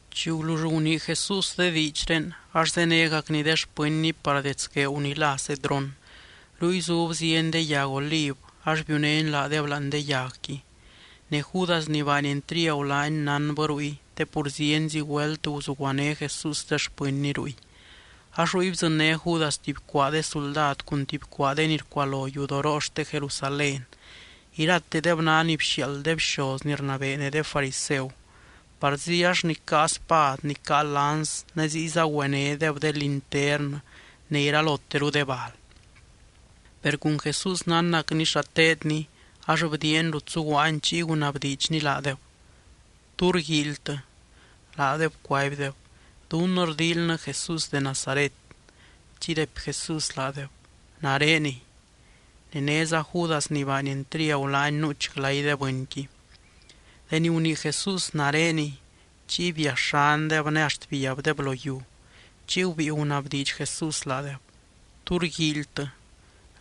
Chi gulull gunii Jesús de diidxré, ax zénegacny de xpɨnny par dets gueeu ni lá Cedrón. Ruy zub zieny de yag oliv ax biunény laadeb láani de yagqui. Ne Judas ni baany entriagu laany, nánbɨ ruy, te pur zienzi güelt guzuguané Jesús de xpɨnny ruy. Ax ruy bdzɨnné Judas tuby cuaa de suldad, cun tuby cuaa de ni rcualo yudoroo xte Jerusalén. Iratedeb ná ni bxiaald de bxoz ni rnabee ne de fariseu. Parzi ax ni caa spad ni caa lans ne ziyza güenédeb de linternɨ ne iraloteru de bal. Per cun Jesús nánnacny xa teedny ax bdiiany rut zuguaany chiy gunabdiidxny laadeb: —¿Tú rguíilytɨ? Laadeb cuaibdeb: —Dunnɨ rdíilynɨ Jesús de Nazaret. Chiy raipy Jesús laadeb: —Nareniy. Ne néza Judas ni baany entriagu laany, nuuch glay de bɨnqui. Deni gunii Jesús: “Nareniy”, chiy biaxandeb ne axt biabdeb lo yiu. Chiy gubíi gunabdiidx Jesús laadeb: —¿Tú rguíilytɨ?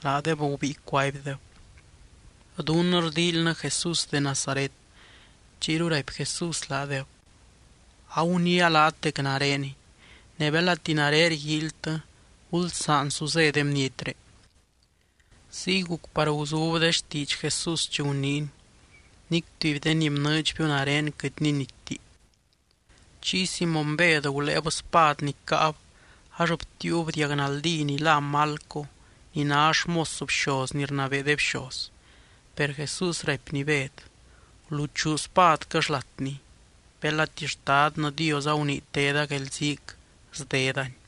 Laadeb gubíi cuaibdeb: —Dunnɨ rdíilynɨ Jesús de Nazaret. Chiyru raipy Jesús laadeb: —Aguniia laat dec nareniy. Ne belati nare rguíilytɨ, gulsaan su zé de bnietré. Ziy guc par guzub de xtiidx Jesús chi guniiny: “Nic tuby de ni bnɨɨdxbiu nare quɨt ninitti.” Chiy Simóny Bed guléeb spad ni caab ax btiiub diag naldí ni lá Malco, ni ná xmos bxoz ni rnabee de bxoz. Per Jesús raipny Bed: —Guluchuu spadquɨ xlatni. Belati Xtadnɨ Dios agunii teda guelziic, sdedani.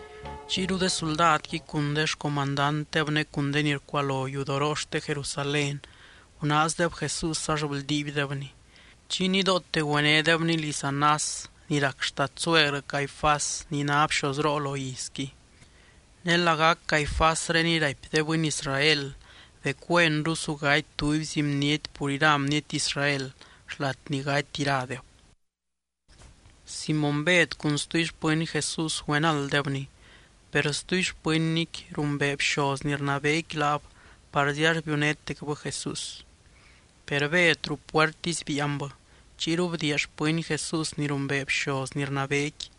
Chiyru de suldadqui, cun xcomandantdeb ne cun de ni rcualo yudoroo xte Jerusalén gunaazdeb Jesús ax bldiibdebny. Chiy nidoote güenédebny liz Anás ni rac xtadsuegrɨ Caifás ni ná bxozroo lo izqui. Ne lagac Caifásreniy raipy de bɨny Israel dec güenru su gaty tubyzi bniety pur ira bniety Israel, xlat ni gaty iradeb. Simóny Bed cun stuby xpɨny Jesús güenalddebny. Per stuby xpɨnnyqui rumbee bxoz ni rnabeequi laab parzi ax biunétecbɨ Jesús. Per Bed ruu puertisy biianbɨ. Chiyru bdiia xpɨny Jesús ni rumbee bxoz ni rnabeequi,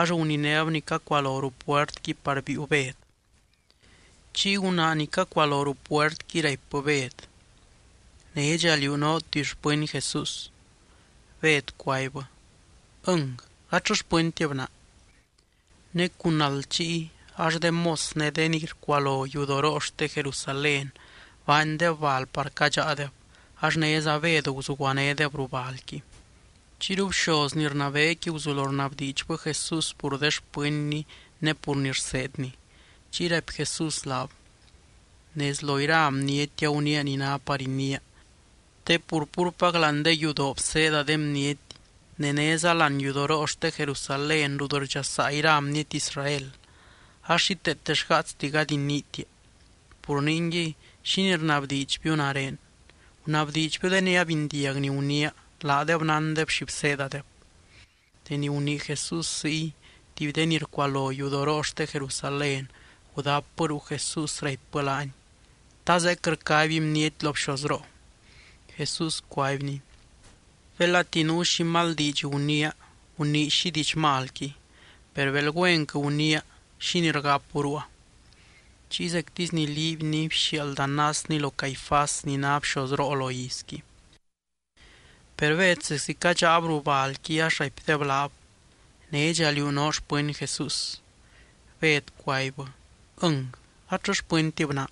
ax guninéb ni cacualo ruu puertqui par biiu Bed. Chiy gunaa ni cacualo ruu puertqui raipbɨ Bed: —¿Nédxa liú noo tuby xpɨny Jesús? Bed cuaibbɨ: —Ɨng, gatllɨ xpɨntib naa. Ne cun nald chiy, ax de mos ne de ni rcualo yudoroo xte Jerusalén baandeb bal par cadxáadeb. Ax néza Bed guzuguanédeb ruu balqui. Chiyru bxoz ni rnabeequi guzulo rnabdiidxbɨ Jesús pur de xpɨnny ne pur ni rseedny. Chiy raipy Jesús laab: —Nez lo ira bniety aguniia ni ná par iniia. Te pur púrpac láani de yudoo bseeda de bniety ne néza láani yudoroo xte Jerusalén rut rdxasaa ira bniety Israel. Ax xíteete xgaatsti gady iniitia. Pur ningui, ¿xínii rnabdiidxbiu nare? Gunabdiidxbiu de ni abindiag ni guniia, laadeb nándeb xi bseedadeb. Deni gunii Jesús ziy, tuby de ni rcualo yudoroo xte Jerusalén, gudapbɨ ruu Jesús raipbɨ laany: —¿Ta zeec rcaby bniety lo bxozroo? Jesús cuaibny: —Belati nuu xi mal diidx guniia, gunii xi diidx malqui. Per bel güenquɨ guniia, ¿xínii rgapu ruua? Chiy zectisy ni liibyny bxiaald Anásny lo Caifás ni ná bxozroo lo izqui. Per Bed zeczi cadxáab ruu balqui ax raipdeb laab: —¿Nédxa liú noo xpɨny Jesús? Bed cuaibbɨ: —Ɨng, gatllɨ xpɨntib naa.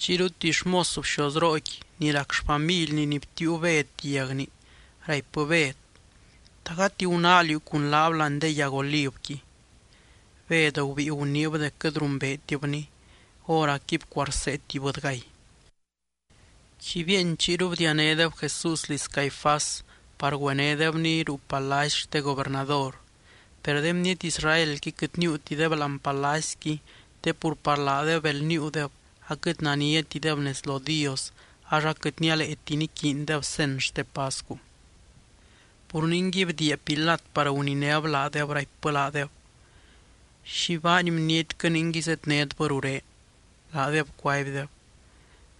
Chiyru tuby xmos bxozrooqui, ni rac xfamilni ni btiiu Bed diagni raipbɨ Bed: —¿Ta gati gunáa liú cun laab láani de yag olivqui? Bed gubíi guniib dec quɨt rumbeetibny. Hóracqui bcuarsee tuby bɨdygay. Chi bieeny, chiyru bdianédeb Jesús liz Caifás par güenédebny ruu palacy xte gobernador. Per de bniety Israelqui quɨt níiutideb láani palacyqui te pur par laadeb bel níiudeb aquɨt naniatideb nez lo Dios, ax aquɨt nialeeti niquiindeb cen xte pascu. Pur ningui, bdiia Pilat par guninéb laadeb raipbɨ laadeb: —¿Xi baany bnietquɨ ningui zednétbɨ ruré? Laadeb cuaibdeb: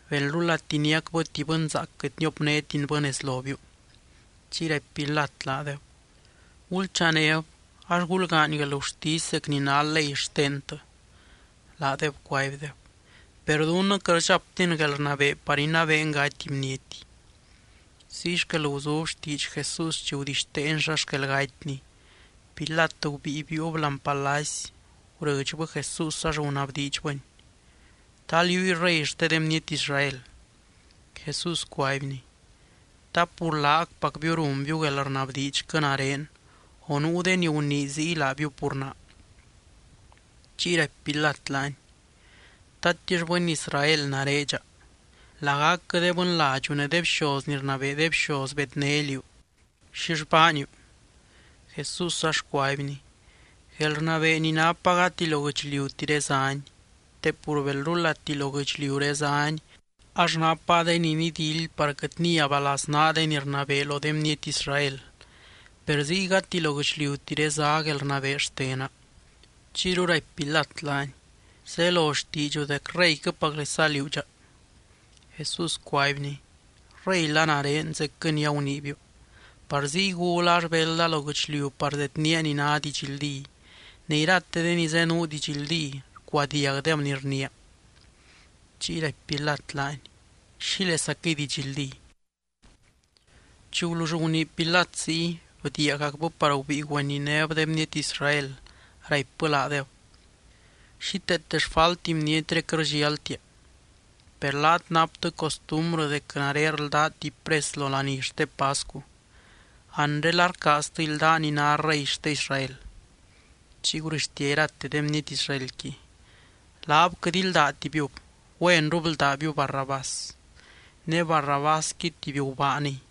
—Belrulati niacbɨ tuby bɨnzaac quɨt niopnétinbɨ nez lobiu. Chiy raipy Pilat laadeb: —Gulchanéb, ax gulgaany guelgurtisy zec ni ná ley xtentɨ. Laadeb cuaibdeb: —Per dunnɨ quɨt rdxaptin guelrnabee par inabeen gaty bniety. Ziy xquel guzub xtiidx Jesús chi gudixteeny xa xquel gatyny. Pilat gubíi biiub láani palacy, gurɨdxbɨ Jesús ax gunabdiidxbɨny: —¿Ta liúy Rey xte de bniety Israel? Jesús cuaibny: —¿Ta pur laacpacbiu runbiu guelrnabdiidxquɨ nare, o nuu de ni gunii ziy laabiu pur naa? Chiy raipy Pilat laany: —¿Tatix bɨny Israel nare dxa? Lagacquɨ de bɨnladxu ne de bxoz ni rnabee de bxoz bedné liú. ¿Xill baaniu? Jesús ax cuaibny: —Guelrnabee ni napa gati lo guɨchliutiré záni. Te pur belrulati lo guɨchliuré záni, ax napa de ni nidildy par quɨt niaba laznaa de ni rnabee lo de bniety Israel. Per ziy gati lo guɨchliutiré zá guelrnabee xtena. Chiyru raipy Pilat laany: —Zelo xtiidxu dec reyquɨpaclesa liú dxa. Jesús cuaibny: —Reyla nare, zecquɨ ni aguniibiu. Par ziy gula ax belda lo guɨchliu par zedniia ni ná didxldí. Ne irate de ni zenuu didxldí, rcuadiagdeb ni rniia. Chiy raipy Pilat laany: —¿Xílezaquɨy didxldí? Chi gulull gunii Pilat ziy, bdiiagacbɨ par gubíi güeninéb de bniety Israel, raipbɨ laadeb: —Xíteete xfalti bnietré quɨt rdxialtia. Per laat naptɨ costumbrɨ dec nare rldaa tuby pres lo laní xte pascu. Anre, ¿la rcaaztɨ ildaa ni ná Rey xte Israel? Chiy gurɨxtia irate de bniety Israelqui: —¡Laab quɨt ildátibiu! ¡Güenru bldábiu Barrabás! Ne Barrabásqui tuby gubaaniy.